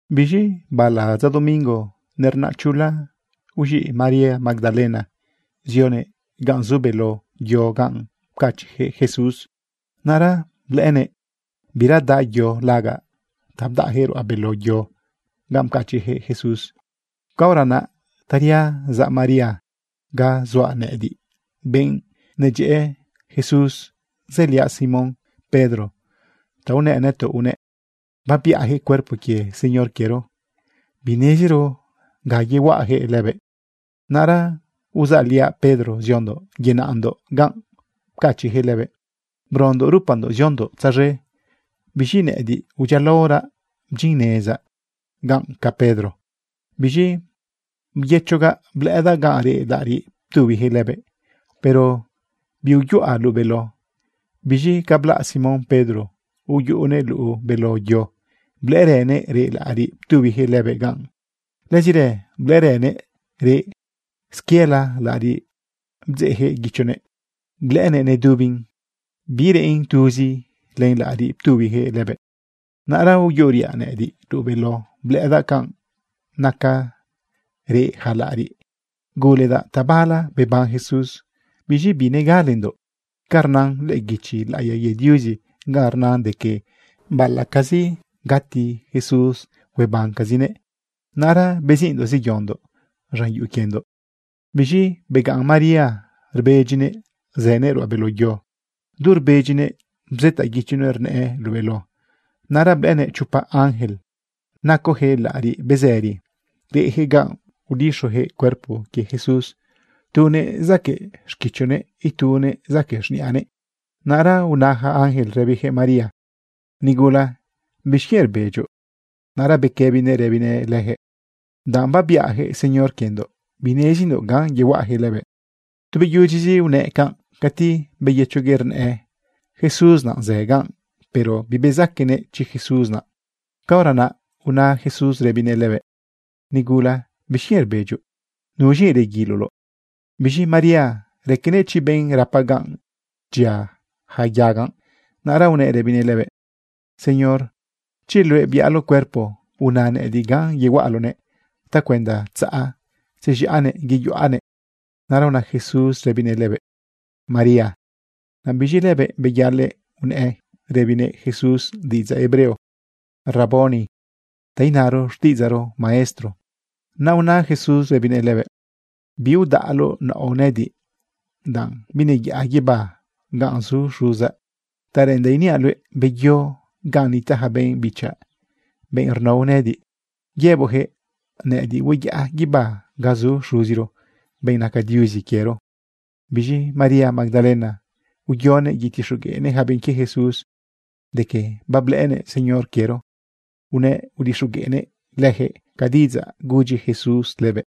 Biz̃i bala dza domingo nernaꞌ chula, uz̃iꞌ María Magdalena zionëꞌ ganꞌ zu beló yo ganꞌ pcachiꞌyaquëꞌ Jesús. Naꞌra blëꞌënëꞌ bira daꞌ yo lagaꞌ ta bdaꞌyaquëꞌ ruꞌa beló yo ganꞌ pcachiꞌyaquëꞌ Jesús. Caora naꞌ taria zaꞌ María ga zuaꞌ nëꞌëdiꞌ, benꞌ Jesús nedyëꞌë, zëliaꞌ Simón Pedro, ta unëꞌ nëtoꞌ unëꞌ: ―Babiꞌayaquëꞌ cuerpo quie Señor quiero. Bineziro ga yehuaꞌayaquëꞌ lëbëꞌ. Naꞌra uzaꞌliaꞌ Pedro ziondoꞌ yenaꞌndoꞌ ganꞌ pcachiꞌyaquëꞌ lëbëꞌ. Brondoꞌ rupandoꞌ ziondoꞌ tzaz̃e. Biz̃i nëꞌëdiꞌ udyialaoraꞌ bdyinnezaꞌ ganꞌ ca Pedro. Biz̃i byëchogaꞌ blëꞌëdaꞌ ganꞌ reꞌ laꞌariꞌ ptubiyaquëꞌ lëbëꞌ, pero biuyuꞌa luꞌu beló. Biz̃i ca blaꞌ Simón Pedro, uyuꞌunëꞌ luꞌu beló yo, blëꞌërënëꞌ reꞌ laꞌariꞌ ptubiyaquëꞌ lëbëꞌ ganꞌ. Lëzirë blëꞌërënëꞌ reꞌ squiela laꞌariꞌ bdzeꞌyaquëꞌ guichonëꞌ. Blëꞌënëꞌ nedubin, bireꞌn tuzi len laꞌariꞌ ptubiyaquëꞌ lëbëꞌ. Naꞌra uyuꞌuriaꞌ nëꞌëdiꞌ luꞌu beló, blëꞌëdaꞌ canꞌ naca reꞌ yaca laꞌariꞌ, guledaꞌ tabala beban Jesús. Biz̃i binegalendoꞌ ca rnan lëꞌë guichi laꞌiya quie Diuzi ganꞌ rnan de que baꞌalaꞌcazi gati Jesús, huebancazinëꞌ. Naꞌra beziꞌndoꞌ zeyondoꞌ z̃an yuꞌu quiendoꞌ. Biz̃i begaꞌn María rbedyinëꞌ zënëꞌ ruꞌa beló yo. Du rbedyinëꞌ bzëtaꞌ guichonëꞌ rnëꞌë luꞌu beló. Naꞌra blëꞌënëꞌ chopa ángel nacoyaquëꞌ laꞌariꞌ bezëri. Reꞌyaquëꞌ ganꞌ udixuyaquëꞌ cuerpo quie Jesús, tunëꞌ zaquëꞌ xquichonëꞌ, ituëꞌ zaquëꞌ z̃niꞌanëꞌ. Naꞌra una yaca ángel rëbiyaquëꞌ María: ―Nigula, ¿bixquienꞌ rbedyoꞌ? Naꞌra bequëbinëꞌ rëbinëꞌ leyaquëꞌ: ―Danꞌ babiꞌayaquëꞌ Señor quiendoꞌ. Binezindoꞌ ganꞌ yehuaꞌayaquëꞌ lëbëꞌ. Tu beyudyizi unëꞌ canꞌ, cati beyëchoguëꞌ rnëꞌë Jesús naꞌ zë ganꞌ. Pero bibezaquenëꞌ chi Jesús naꞌ. Caora naꞌ una Jesús rëbinëꞌ lëbëꞌ: ―Nigula, ¿bixquienꞌ rbedyoꞌ? ¿Nuz̃i reguiloloꞌ? Biz̃i María raquenëꞌ chi benꞌ rapa ganꞌ dyia yaca yaga. Naꞌra unëꞌ rëbinëꞌ lëbëꞌ: ―Señor, chi luëꞌ biꞌaloꞌ cuerpo, una nëꞌëdiꞌ ganꞌ yehuaꞌaloꞌnëꞌ ta cuenda tzaꞌ tzez̃iꞌanëꞌ yeyuꞌanëꞌ. Naꞌra una Jesús rëbinëꞌ lëbëꞌ: ―¡María! Naꞌ biz̃i lëbëꞌ, beyalëꞌ unëꞌ rëbinëꞌ Jesús diꞌidzaꞌ hebreo: ―¡Raboni! ―ta inaro xtiꞌidzaꞌro: Maestro. Naꞌ una Jesús rëbinëꞌ lëbëꞌ: ―Biudaꞌloꞌ naoꞌ nëꞌëdiꞌ, danꞌ bineyaꞌa guibá ganꞌ zu Xuzaꞌ. Ta reꞌendaꞌ iniaꞌ luëꞌ, beyo ganꞌ nitaꞌ yaca benꞌ bichaꞌ, benꞌ rnao nëꞌëdiꞌ, yëboꞌyaquëꞌ nëꞌëdiꞌ hueyaꞌa guibá ga zu Xuziro, benꞌ naca Diuzi quiero. Biz̃i María Magdalena uyonëꞌ yetixogueꞌnëꞌ yaca benꞌ quie Jesús de que bablëꞌënëꞌ Señor quiero. Unëꞌ udixogueꞌnëꞌ leyaquëꞌ ca diꞌidzaꞌ gudyi Jesús lëbëꞌ.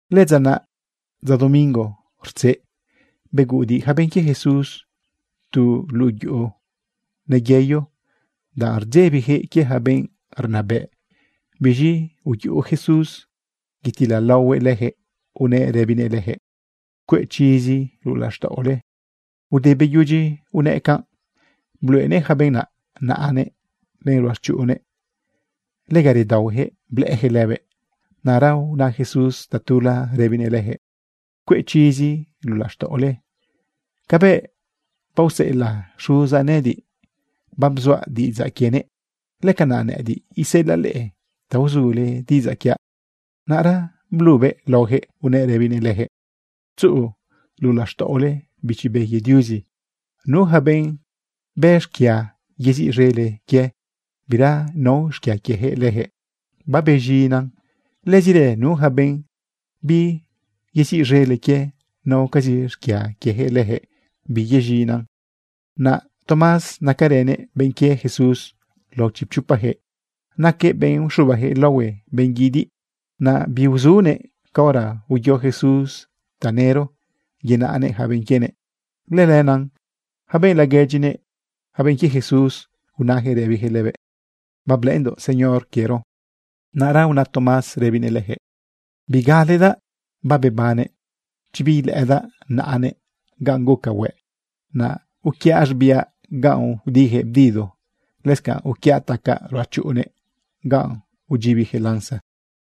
Lëdza naꞌ, dza domingo rtzeꞌ, beguꞌudiꞌ yaca benꞌ quie Jesús tu luꞌu yuꞌu neyeyo, danꞌ rdzebiyaquëꞌ quie yaca benꞌ rnabëꞌ. Biz̃i uyuꞌu Jesús yatilalaohuëꞌ leyaquëꞌ unëꞌ rëbinëꞌ leyaquëꞌ: ―Cueꞌ chizi luꞌu laxtaꞌole. Ude beyudyi unëꞌ canꞌ, bluꞌenëꞌ yaca benꞌ naꞌ naꞌanëꞌ len ruꞌachuꞌunnëꞌ. Lega redaohueyaquëꞌ blëꞌëyaquëꞌ lëbëꞌ. Naꞌra una Jesús tatula rëbinëꞌ leyaquëꞌ: ―Cueꞌ chizi luꞌu laxtaꞌole. Cabëꞌ baoseꞌelaꞌ Xuzaꞌ nëꞌëdiꞌ babzuaꞌ diꞌidzaꞌ quienëꞌ, lëcanaꞌ nëꞌëdiꞌ iseꞌelaꞌ leꞌe ta uzule diꞌidzaꞌ quiaꞌ. Naꞌra blubëꞌ laoyaquëꞌ, unëꞌ rëbinëꞌ leyaquëꞌ: ―Tzuꞌu luꞌu laxtaꞌole Bichi Be quie Diuzi. Nu yaca benꞌ bë xquia yeziꞌz̃ele quie, bira nao xquia quieyaquëꞌ leyaquëꞌ babez̃inan. Lëzirë nu yaca benꞌ biyeziꞌz̃ele quie, naocazi xquia quieyaquëꞌ leyaquëꞌ bibez̃inan. Naꞌ Tomás, nacarënëꞌ benꞌ quie Jesús lao chipchopayaquëꞌ, naquëꞌ benꞌ uxubayaquëꞌ laohue benꞌ guidiꞌ, naꞌ biuzunëꞌ caora uyo Jesús tanëro yenaꞌnëꞌ yaca benꞌ quienëꞌ. Lëlenaꞌ yaca benꞌ laguedyinëꞌ, yaca benꞌ quie Jesús, unayaquëꞌ rëbiyaquëꞌ lëbëꞌ: ―Bablëꞌëndoꞌ Señor quiero. Naꞌra una Tomás rëbinëꞌ leyaquëꞌ: ―Bigaledaꞌ babebannëꞌ chi biilëꞌëdaꞌ naꞌanëꞌ ganꞌ guca hueꞌ, naꞌ uquiaꞌ z̃biaꞌ ganꞌ udiyaquëꞌ bdido, lëscanꞌ uquiaꞌ tacaꞌ ruꞌachuꞌunnëꞌ ganꞌ udyibiyaquëꞌ lanza.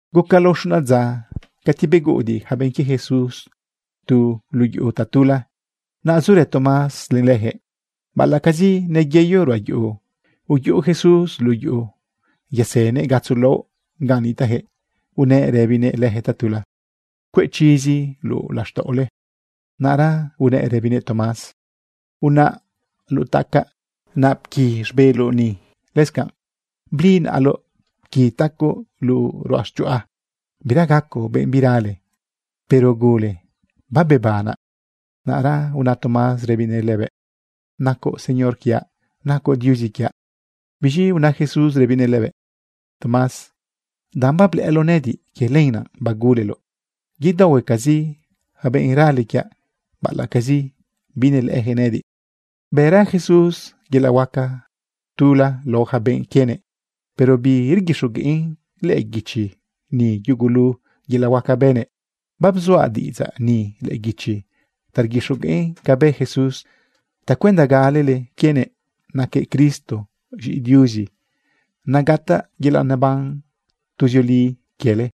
Guca lao xuna dza, cati beguꞌudiꞌ yaca benꞌ quie Jesús tu luꞌu yuꞌu tatula. Naꞌ zurë Tomás len leyaquëꞌ. Baꞌalaꞌcazi neyeyo ruꞌa yuꞌu, uyuꞌu Jesús luꞌu yuꞌu yasënëꞌ gatzo laꞌo ganꞌ nitaꞌyaquëꞌ. Unëꞌ rëbinëꞌ leyaquëꞌ tatula: ―Cueꞌ chizi luꞌu laxtaꞌole. Naꞌra unëꞌ rëbinëꞌ Tomás: ―Unaꞌ luꞌu tacaꞌ, naꞌ pqui z̃beloꞌ ni. Lëscanꞌ bli naꞌaloꞌ, pqui tacoꞌ luꞌu ruꞌachuꞌa. Bira gacoꞌ benꞌ birale, pero gule babebanaꞌ. Naꞌra una Tomás rëbinëꞌ lëbëꞌ: ―Nacoꞌ Señor quiaꞌ, nacoꞌ Diuzi quiaꞌ. Biz̃i una Jesús rëbinëꞌ lëbëꞌ: ―Tomás, danꞌ bablëꞌëloꞌ nëꞌëdiꞌ, quie lenaꞌ baguleloꞌ. Yedaohuecazi yaca benꞌ rale quiaꞌ, baꞌalaꞌcazi binelëꞌëyaquëꞌ nëꞌëdiꞌ. Bëra Jesús yelaꞌ huaca tula lao yaca benꞌ quienëꞌ, pero birguixogueꞌn lëꞌë guichi ni yugulu yelaꞌ huaca bënëꞌ. Babzuaꞌ diꞌidzaꞌ ni lëꞌë guichi ta rguixogueꞌn ca bë Jesús tacuenda galele quienëꞌ naquëꞌ Cristo, z̃iꞌi Diuzi, naꞌ gataꞌ yelaꞌ neban tuzioli quiele.